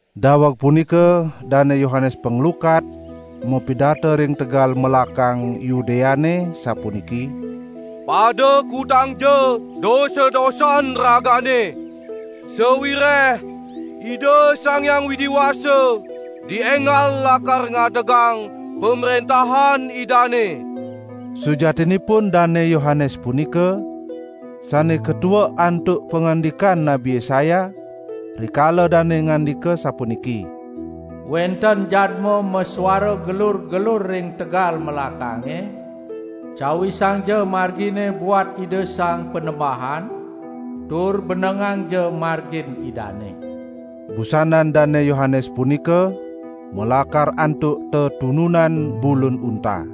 Daweg punika Dane Yohanes Panglukat mapidarta ring tegal melakang Yudeane, sapuniki: "Pada kutangja dosa-dosan ragane! Sawireh Ida Sang Hyang Widi Wasa dienggal lakar ngadegang Pamrentahan Idane!" Sujatinipun Dane Yohanes punika, sane katuek antuk pangandikan Nabi Yesaya, rikala dane ngandika asapuniki: "Wenten jadma masuara gelur-gelur ring tegal melakange, cawisangja margine buat Ida Sang Panembahan tur benengangja margin Idane!" Busanan Dane Yohanes punika malakar antuk tetununan bulun unta.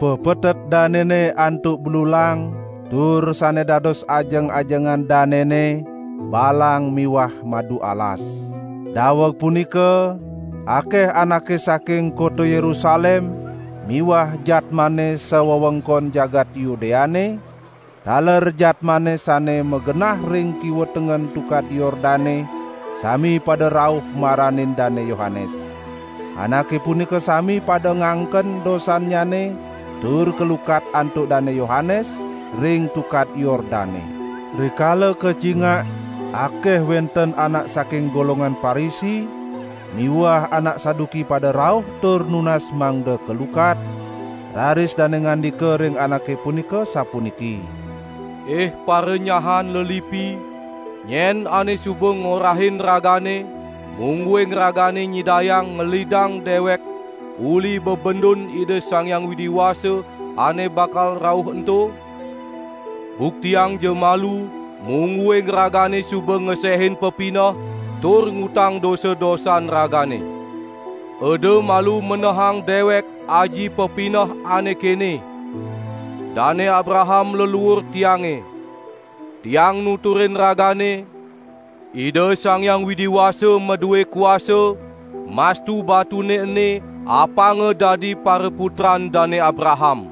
Pepetet danene antuk blulang, tur sane dados ajeng-ajengan danene, balang miwah madu alas. Daweg punika akeh anake saking kota Yerusalem miwah jadmane sawewengkon jagat Yudeane, taler jadmane sane magenah ring kiwa tengen Tukad Yordane sami pada rauh maranin Dane Yohanes. Anake punika sami pada ngangken dosannyane tur kalukat antuk Dane Yohanes ring Tukad Yordane. Rikala kacingak akeh wenten anak saking golongan Parisi miwah anak Saduki pada rauh tur nunas mangda kalukat, raris dane ngandika ring anake punika sapuniki: "Ih paranyahan lelipi, nyen ane suba ngorahin ragane, mungguing ragane nyidayang ngelidang dewek uli bebendun Ida Sang Hyang Widi Wasa ane bakal rauh ento? Buktiangja malu mungguing ragane suba ngesehin pepineh tur ngutang dosa-dosan ragane. Eda malu menehang dewek aji pepineh ane kene: Dane Abraham leluur tiange! Tiang nuturin ragane, Ida Sang Hyang Widi Wasa madue kuasa mastu batune ene apanga dadi paraputran Dane Abraham.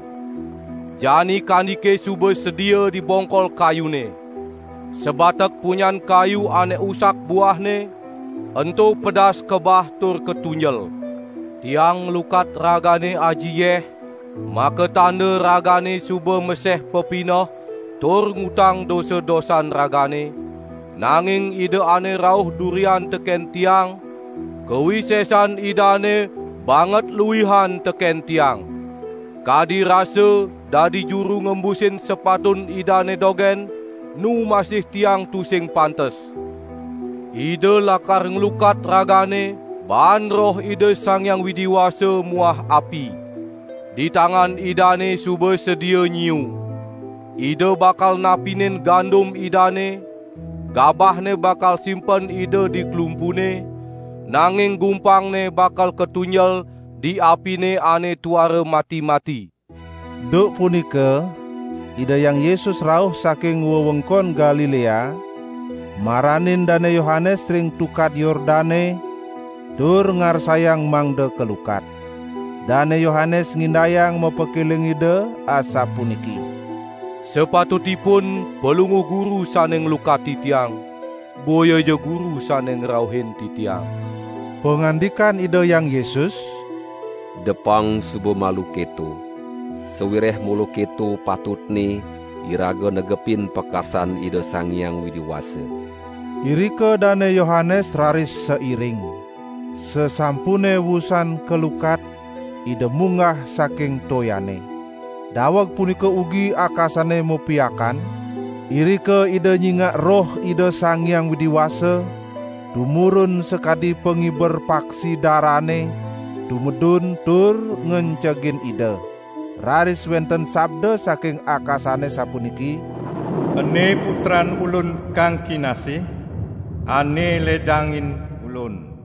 Jani kandike suba sedia di bongkol kayune. Sabatek punyan kayu ane usak buahne, ento pedas kabah tur katunjel. Tiang nglukat ragane aji yeh, makatanda ragane suba maseh pepineh tur ngutang dosa-dosan ragane, nanging Ida ane rauh durian teken tiang, kawisesan Idane banget luihan teken tiang. Kadi rasa dadi juru ngembusin sepatun Idane dogen nu masih tiang tusing pantes. Ida lakar nglukat ragane baan Roh Ida Sang Hyang Widi Wasa muah api. Di tangan Idane suba sedia nyiu. Ida bakal napinin gandum Idane, gabahne bakal simpen Ida di klumpune, nanging gumpangne bakal katunjel di apine ane tuara mati-mati." Duk punika Ida Hyang Yesus rauh saking wewengkon Galilea maranin Dane Yohanes ring Tukad Yordane tur ngarsayang mangda kalukat. Dane Yohanes ngindayang mapakeling Ida, asapuniki: "Sapatutipun Palungguh Guru sane nglukat titiang, boyaja Guru sane ngrauhin titiang." Pangandikan Ida Hyang Yesus: "Depang suba malu keto, sawireh mula keto patutne iraga negepin pakarsan Ida Sang Hyang Widi Wasa." Irika Dane Yohanes raris sairing. Sasampune wusan kalukat, Ida munggah saking toyane. Daweg punika ugi akasane mapiakan, irika Ida nyingak Roh Ida Sang Hyang Widi Wasa tumurun sakadi pangiber paksi darane tumedun tur ngencegin Ida. Raris wenten sabda saking akasane sapuniki: "Ene putran Ulun kang kinasih, ane ledangin Ulun."